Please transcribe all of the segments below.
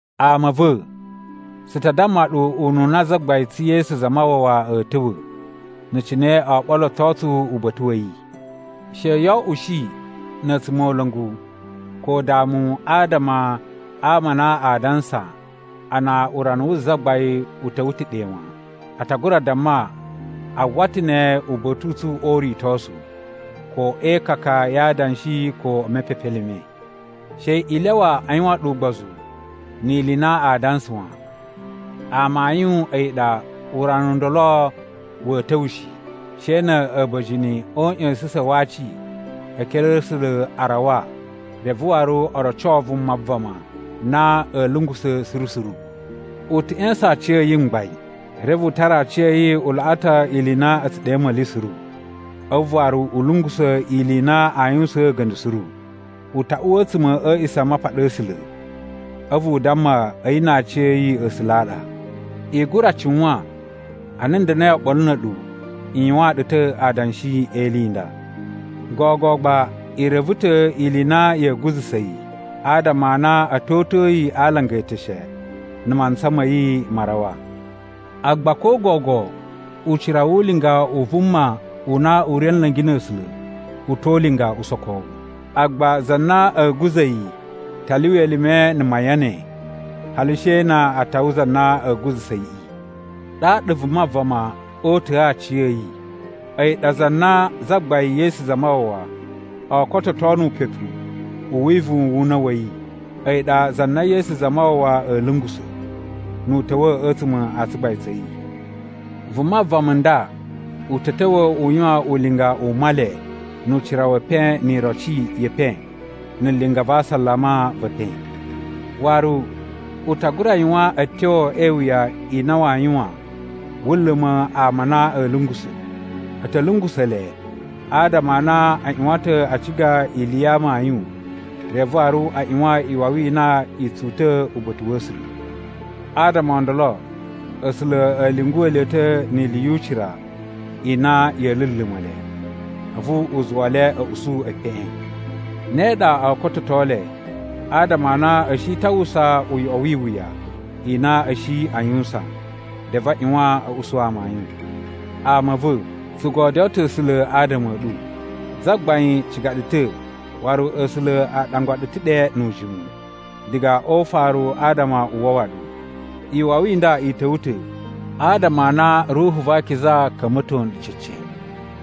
Ama a̱ va̱, tsu ta damma ɗu ununa Zagbain tsu Yesu Zamawawa a̱a̱ ta̱wa̱, na̱ cine oo ɓoloto tsu uba̱ta̱ wa̱ yi. She yoo oꞌushi na̱ a̱tsumola̱ngu ko udamu adama a ama a na aa dansa a na urana wu Zagbain u ta̱wa̱ ta̱ ɗe wan. A ta gura damma a uwwa ta̱ ne uba̱ta̱ u tsu o uritosu, ko e ikaka ya adanshi, ko e mepepelime. She i lyawa a yuwan ɗu ugbozu ni ili i na aa dansa wan. Amayun a̱yi ɗa urana u ndolo wa̱a̱ ta̱wa̱ shi, she na̱ a̱ba̱jini o uꞌya̱sa̱sa̱n wa aci e ekere a̱ A̱sula̱ a rawa reve waru o roco Vuma Vama na a̱a̱ lungusa̱ suru suru. U ta̱ ꞌya̱sa̱n aciya̱yi mgbain, reve u tara aciya̱yi u laꞌa ta̱ ili i na a̱ tsu ɗe a̱a̱ma̱li suru. A̱vu waru u lungusa̱ ili i na aa yuwusaan a̱ga̱nda̱ suru. U ta uwa a̱tsuma̱ a̱ A̱a̱ꞌisamapaɗa a̱ A̱sula̱, a̱vu u damma a̱yi na aciya̱yi A̱sula̱ a ɗa. I gura cuwan ana n da̱na̱i oɓolo na̱ a̱ɗu, n yuwaan ɗu ta̱ adanshi e ili i nda. Gogo gba i reve ta̱ ili i na ya̱a̱ guza̱sa̱ yi, adama a na a̱ to uta̱a̱ yi a alanga e eteshe na̱ mantsa ma̱ yi ma rawa. Agba ko gogo ucira wu ulinga u vuma u na u ri a̱ nla̱ngi na̱ A̱sula̱ u to ulinga usokowu. Agba za na a̱a̱ guza̱ yi ta lyuwa elime na̱ mayan ne hali she na a tawa za na a̱a̱ guza̱sa̱ yiꞌi. Ɗaɗa Vuma Vama oo uta̱a̱ aciya̱yi, a̱yi ɗa za na Zagbain Yesu Zamawawa oo kototo nu upepu u wivuwun wu una̱ wa̱ yi. A̱yi ɗa za na Yesu Zamawawa a̱a̱ lungusa̱, nu u ta̱wa̱ a̱tsuma̱ a tsugbain tsa̱ yi. Vuma vama n nda u ta̱ ta̱wa̱ u yuwan ulinga u Male nu ucira we epen ni iroci ye epen na̱ linga va asalama ve epen. Waru u ta gura yuwan a̱tyo e iwuya i na waa yuwan wu luma̱ ama a na a̱a̱ lungusa̱. A̱ ta̱ lungusa̱ le adama a na a ꞌyuwan ta̱ a ciga ili ya amayun reve waru a ꞌyuwan iwawi i na i tsu uta̱ uba̱ta̱ wa̱ A̱sula̱. Adama o ndolo A̱sula̱ a̱ lyunguwa̱ le ta̱ ni ili yu ucira i na ya̱a̱ luluma̱ le, a̱vu u zuwa le a̱ usu epeꞌen. Ne ɗa oo kototo le adama a na a̱ shi ta̱ a uwwusa uyoꞌo wi iwuya i na a̱ shi a yuwusan, reve a ꞌyuwan a̱ usu amayun. Ama a̱ va̱, tsu godyoo ta̱ A̱sula̱ adama a̱ ɗu. Zagbain ciga ɗu ta̱ waru A̱sula̱ a ɗangwa ɗu ta̱ ɗe nu ujimu diga o ufaru adama u wawa ɗu. Iwawi i nda i ta̱wa̱ ta̱ adama a na Ruhu va Akiza ka̱mba̱to nɗu cece,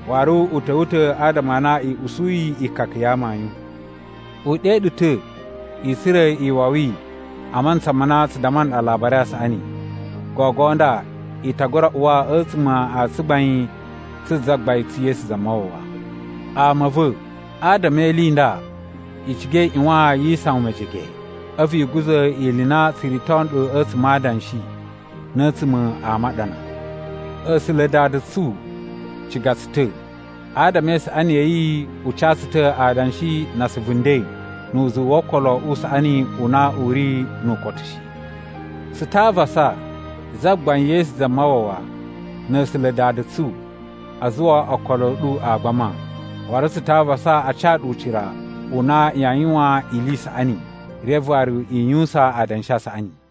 waru u ta̱wa̱ ta̱ adama a na i usuyi ikaka ya amayun. U ɗe ɗu ta̱ i tsura̱ iwawi a mantsa ma na tsu damma nɗu Alabari a Saꞌani. Gogo nda i ta gura uwa a̱tsuma̱ a tsugbain tsu Zagbain tsu Yesu Zamawawa. Ama a̱ va̱, adama e ili i nda, i ciga i ꞌyuwan yi isawan mejege, a̱vu i guza̱ ili i na tsu rito nɗu a̱tsuma̱ a adanshi na̱ a̱tsuma̱ a maɗana. A̱sula̱ Dada tsu ciga tsu ta̱. Adama e isaꞌani ya̱ yi u ca tsu ta̱ adanshi na asuvu nden nu uzuwu wo okolo u saꞌani u na u ri nu ukotu shi. Tsu ta avasa Zagbain Yesu Zamawawa na̱ A̱sula̱ Dada tsu a zuwa okolo a̱ ɗu a gbama. Waru tsu ta avasa a ca ɗu ucira u na yaa yuwan ili i saꞌani, reve waru i yuwusan adanshi a saꞌani.